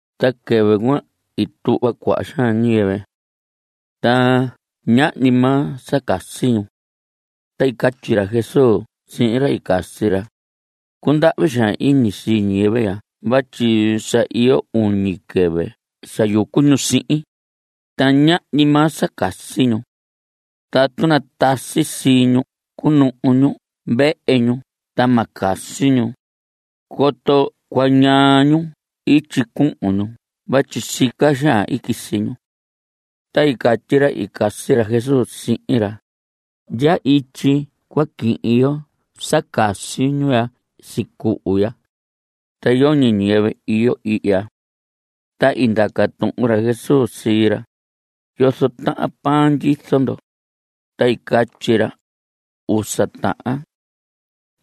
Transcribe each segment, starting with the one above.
Ta quɨvɨ cuan i tuhva cuaha xaan ñiyɨvɨ. Ta ñahñi maa sa casi ñu. Ta i catyi ra Jesús sihin ra i casi ra: Cundahvi xaan iñi sii ñiyɨvɨ ya vatyi sa iyo uñi quɨvɨ sa yucu ñu sihin, ta ñahñi maa sa casi ñu. Tatu natasi sii ñu cunuhu ñu vehe ñu ta ma casi ñu, coto cuañaa ñu ityi cuhun ñu vatyi sica xaan i quisi ñu. Ta i catyi ra i casi ra Jesús sihin ra: ¿Ndya ityi cua quihin yo sa casi ñu ya sicuhu ya? Ta yoñi ñiyɨvɨ iyo ihya. Ta i ndaca tuhun ra Jesús sii ra: ¿Yozo tahan pan ndyizo ndo? Ta i catyi ra: Usa tahan.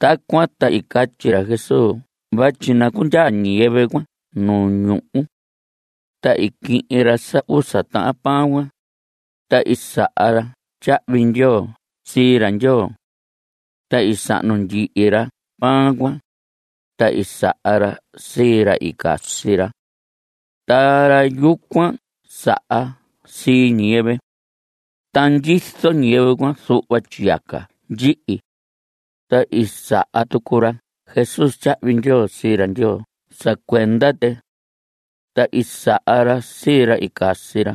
Tacuan ta i catyi ra Jesús vatyi nacundyaa ñiyɨvɨ cuan nu ñuhu. Ta i quihin ra sa usa tahan pan cuan, ta i saha ra tyahvi ndyoo sii ra Ndyoo. Ta i sahnu ndyihi ra pan cuan. Ta i saha ra sii ra i casi ra. Ta ra yucuan saha sii ñiyɨvɨ. Ta ndyizo ñiyɨvɨ cuan zuhva tyiyaca ndyihi. Ta i saha tucu ra Jesús tyahvi ndyoo sii ra Ndyoo sa cuenda tɨ. Ta i saha ra sii ra i casi ra.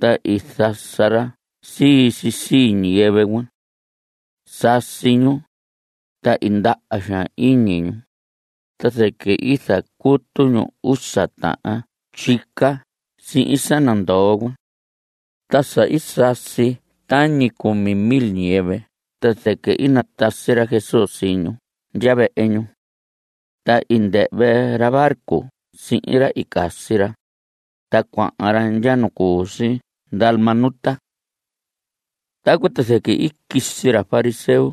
Ta i zasa ra sii si sii ñiyɨvɨ cuan. Sasi ñu, ta i ndaha xaan iñi ñu, ta zɨquɨ i zacutu ñu usa tahan tyica sihin sa nandoo cuan. Ta sa i sasi tañi cumi mil ñiyɨvɨ ta zɨquɨ i natasi ra Jesús sii ñu ndya vehe ñu. Ta i ndɨhvɨ ra barco sihin ra i casi ra, ta cuahan ra ndya nu cu si Dalmanuta. Tacuan ta zɨquɨ i quisi ra fariseo,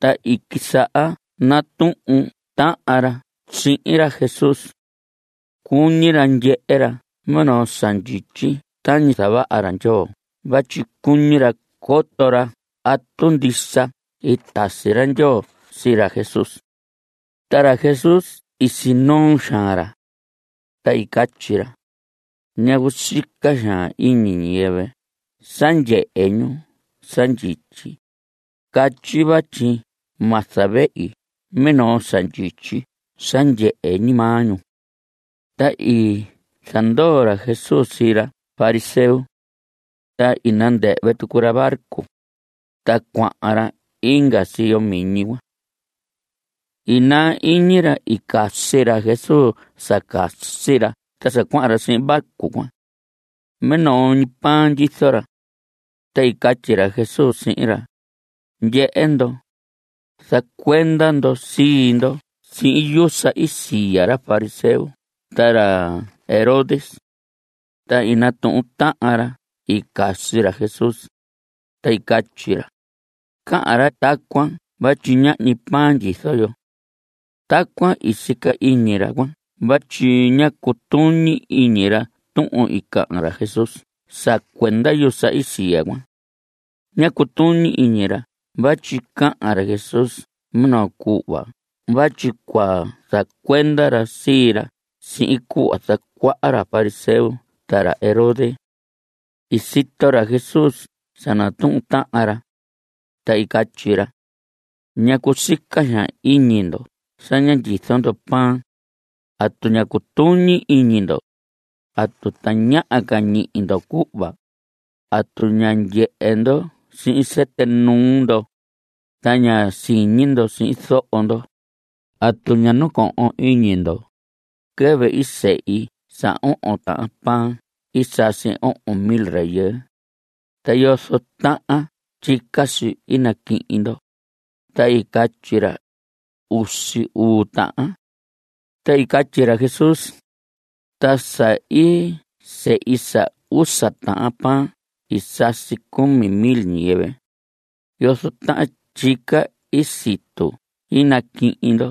ta i quisaha natuhun tahan ra sihin ra Jesús. Cuñi ra ndyehe ra minoo sa ndyityi tañi zavaha ra Ndyoo vatyi cuñi ra coto ra atu ndisa i tasi ra Ndyoo sii ra Jesús. Ta ra Jesús i sinoo xaan ra. Ta i catyi ra: ¿Ñacu sica xaan ñiyɨvɨ sa ndyehe ñu sa ndyityi? Catyi vatyi ma zavehi minoo sa ndyityi sa ndyehe ñi maa ñu. Ta i zandoo ra Jesús sii ra fariseo. Ta i nandɨhvɨ tucu ra barco, ta cuahan ra inga siyo miñi cuan. I naa iñi ra i casi ra Jesús sa casi ra ta sa cuahan ra sihin barco cuan. Minoo ñi pan ndyizo ra. Ta i catyi ra Jesús sihin ra: Ndyehe ndo, zacuenda ndo sii ndo sihin yusa i siya ra fariseo ta ra Herodes. Ta i natuhun tahan ra i casi ra Jesús, ta i catyi ra: Cahan ra tacuan vatyi ñahñi pan ndyizo yo. Tacuan i sica iñi ra cuan vatyi ñá cutuñi iñi ra tuhun i cahan ra Jesús sa cuenda yusa i siya cuan. Ñá cutuñi iñi ra vatyi cahan ra Jesús minoo cuhva vatyi cua zacuenda ra sii ra sihin cuhva zacuaha ra fariseo ta ra Herodes. I sito ra Jesús sa natuhun tahan ra, ta i catyi ra: ¿Ñacu sica xaan iñi ndo sa ña ndyizo ndo pan? ¿Atu ña cutuñi iñi ndo? ¿Atu tañaha ca ñihi ndo cuhva? ¿Atu ña ndyehe ndo sihin sɨtɨ nuu ndo, ta ña siñi ndo sihin zoho ndo? ¿Atu ña nacohon iñi ndo? Quɨvɨ i sehi sa ohon tahan pan i sasi ohon mil rayɨɨ, ¿ta yozo tahan tyica si i naquihin ndo? Ta i catyi ra: Usi uu tahan. Ta i catyi ra Jesús: Ta sa i sehi sa usa tahan pan i sasi cumi mil ñiyɨvɨ, ¿yozo tahan tyica i situ i naquihin ndo?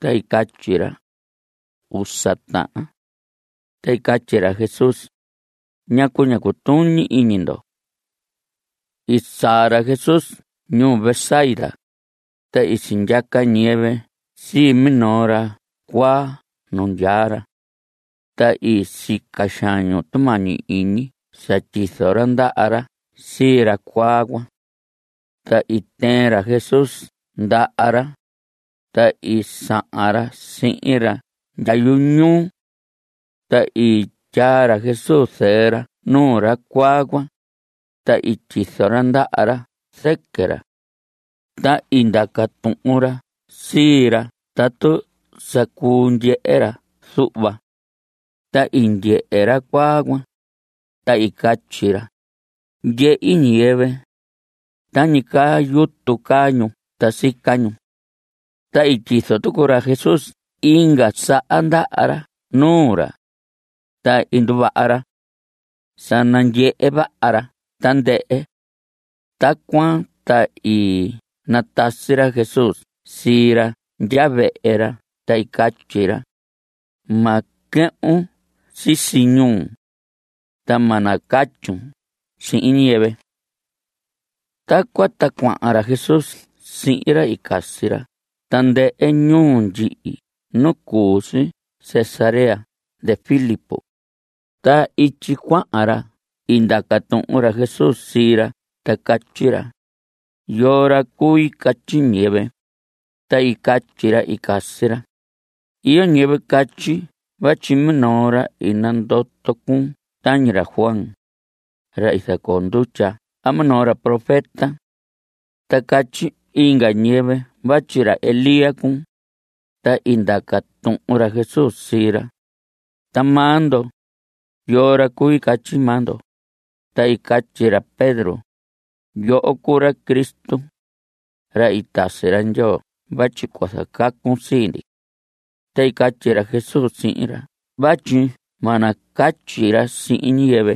Ta i catyi ra: Usa tahan. Ta i catyi ra Jesús: ¿Ñacu ña cutuñi iñi ndo? I saa ra Jesús ñuu Betsaida. Ta i sindyaca ñiyɨvɨ sii minoo ra cuaa nu ndyaa ra. Ta i sica xaan ñu tumañi iñi sa tyizo ra ndaha ra sii ra cuaa cuan. Ta i tɨɨn ra Jesús ndaha ra, ta i sahan ra sihin ra ndya yuñuu. Ta i tyaa ra Jesús zɨɨ ra nuu ra cuaa cuan, ta i tyizo ra ndaha ra zɨquɨ ra. Ta i ndaca tuhun ra sii ra tatu sa cuu ndyehe ra zuhva. Ta i ndyehe ra cuaa cuan, ta i catyi ra: Ndyehi ñiyɨvɨ. Tañi caa yutu caa ñu. Ta sica ñu. Ta i tyizo tucu ra Jesús inga saha ndaha ra nuu ra, ta i nduvaha ra. Sa nandyehe vaha ra tandɨhɨ. Tacuan ta i natasi ra Jesús sii ra ndya vehe ra, ta i catyi ra: Ma quɨhvun sisi ñuu. Ta ma nacatyun sihin ñiyɨvɨ. Tacuan ta cuahan ra Jesús sihin ra i casi ra tandɨhɨ ñuu ndyihi nu cu si Cesarea de Filipo. Ta ityi cuahan ra i ndaca tuhun ra Jesús sii ra ta catyi ra: ¿Yoo ra cui catyi ñiyɨvɨ? Ta i catyi ra i casi ra: Iyo ñiyɨvɨ catyi vatyi minoo ra i nandoto cuun tañi ra Juan, ra i zacoo ndutya a minoo ra profeta. Ta catyi inga ñiyɨvɨ vatyi ra Elías cuun. Ta i ndaca tuhun ra Jesús sii ra: Ta maa ndo, ¿yoo ra cui catyi maa ndo? Ta i catyi ra Pedro: Yoho cuu ra Cristo, ra i tasi ra Ndyoo vatyi cua zacacun sii ndi. Ta i catyi ra Jesús sihin ra vatyi ma nacatyi ra sihin ñiyɨvɨ.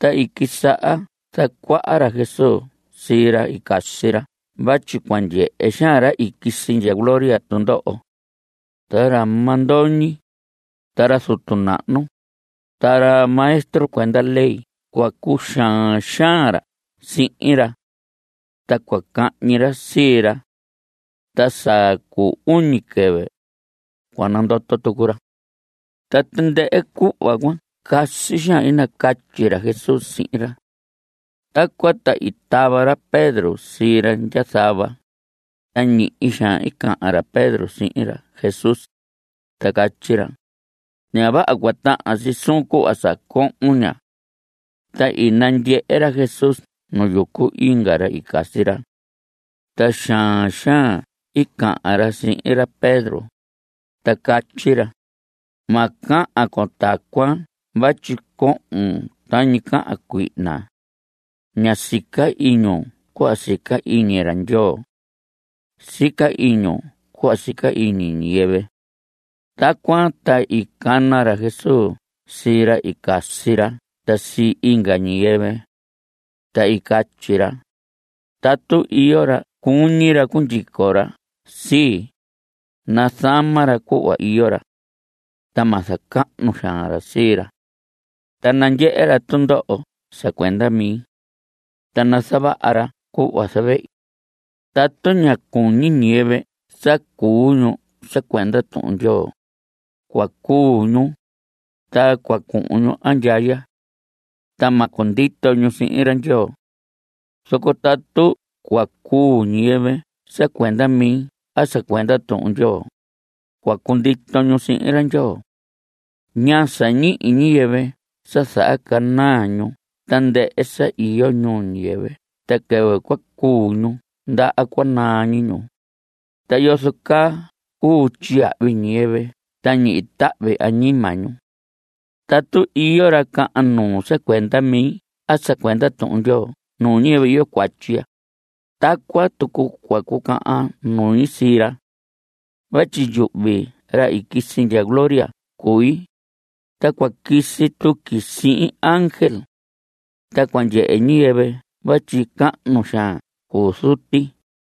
Ta i quisaha zacuaha ra Jesús sii ra i casi ra vatyi cua ndyehe xaan ra i quisi ndya gloria tundoho. Ta ra mandoñi, ta ra zutu nahnu, ta ra maestro cuenda ley cua cuxaan xaan ra sihin ra. Ta cua cahñi ra sii ra. Ta sa cu uñi quɨvɨ, cua nandoto tucu ra. Ta tandɨhɨ cuhva cuan casi xaan i nacatyi ra Jesús sihin ra. Tacuan ta i tava ra Pedro sii ra ndya zava, ta ñihi xaan i cahan ra Pedro sihin ra Jesús, ta catyi ra: Ña vaha cua tahan si suun cuhva sa cohon ña. Ta i nandyehe ra Jesús nu yucu inga ra i casi ra. Ta xaan xaan i cahan ra sihin ra Pedro, ta catyi ra: Ma cahan con tacuan vatyi cohon tañi cahan cuihna. Ña sica iñun cuhva sica iñi ra Ndyoo. Sica iñun cuhva sica iñi ñiyɨvɨ. Tacuan ta i cana ra Jesús sii ra i casi ra ta sii inga ñiyɨvɨ. Ta i catyi ra: Tatu iyo ra cuñi ra cundyico ra sii, nazama ra cuhva iyo ra. Ta ma zacahnu xaan ra sii ra. Ta nandyehe ra tundoho sa cuenda mi. Ta nazavaha ra cuhva zavehi. Tatu ña cuñi ñiyɨvɨ sa cuu ñu sa cuenda Tuhun Ndyoo, cua cuu ñu, ta cua cuhun ñu andyaya. Ta ma cundito ñu sihin ra Ndyoo. Zoco tatu cua cuu ñiyɨvɨ sa cuenda mi a sa cuenda Tuhun Ndyoo, cua cundito ñu sihin ra Ndyoo. ¿Ñaa sa ñihi ñiyɨvɨ sa zahacanaa ñu tandɨhɨ sa iyo ñuu ñiyɨvɨ ta quɨvɨ cua cuu ñu ndaha cua naa ñi ñu? ¿Ta yozo caa cuu tyiyahvi ñiyɨvɨ ta ñihi tahvi añima ñu? Tatu iyo ra cahan nuu sa cuenda mi a sa cuenda Tuhun Ndyoo nuu ñiyɨvɨ iyo cuatyi ya, tacuan tucu cua cucahan nui sii ra. Vatyi yuhvi, ra i quisi ndya gloria cui, ta cua quisi tuqui sihin ángel. Ta cua ndyehe ñiyɨvɨ vatyi cahnu xaan cuu Zuti.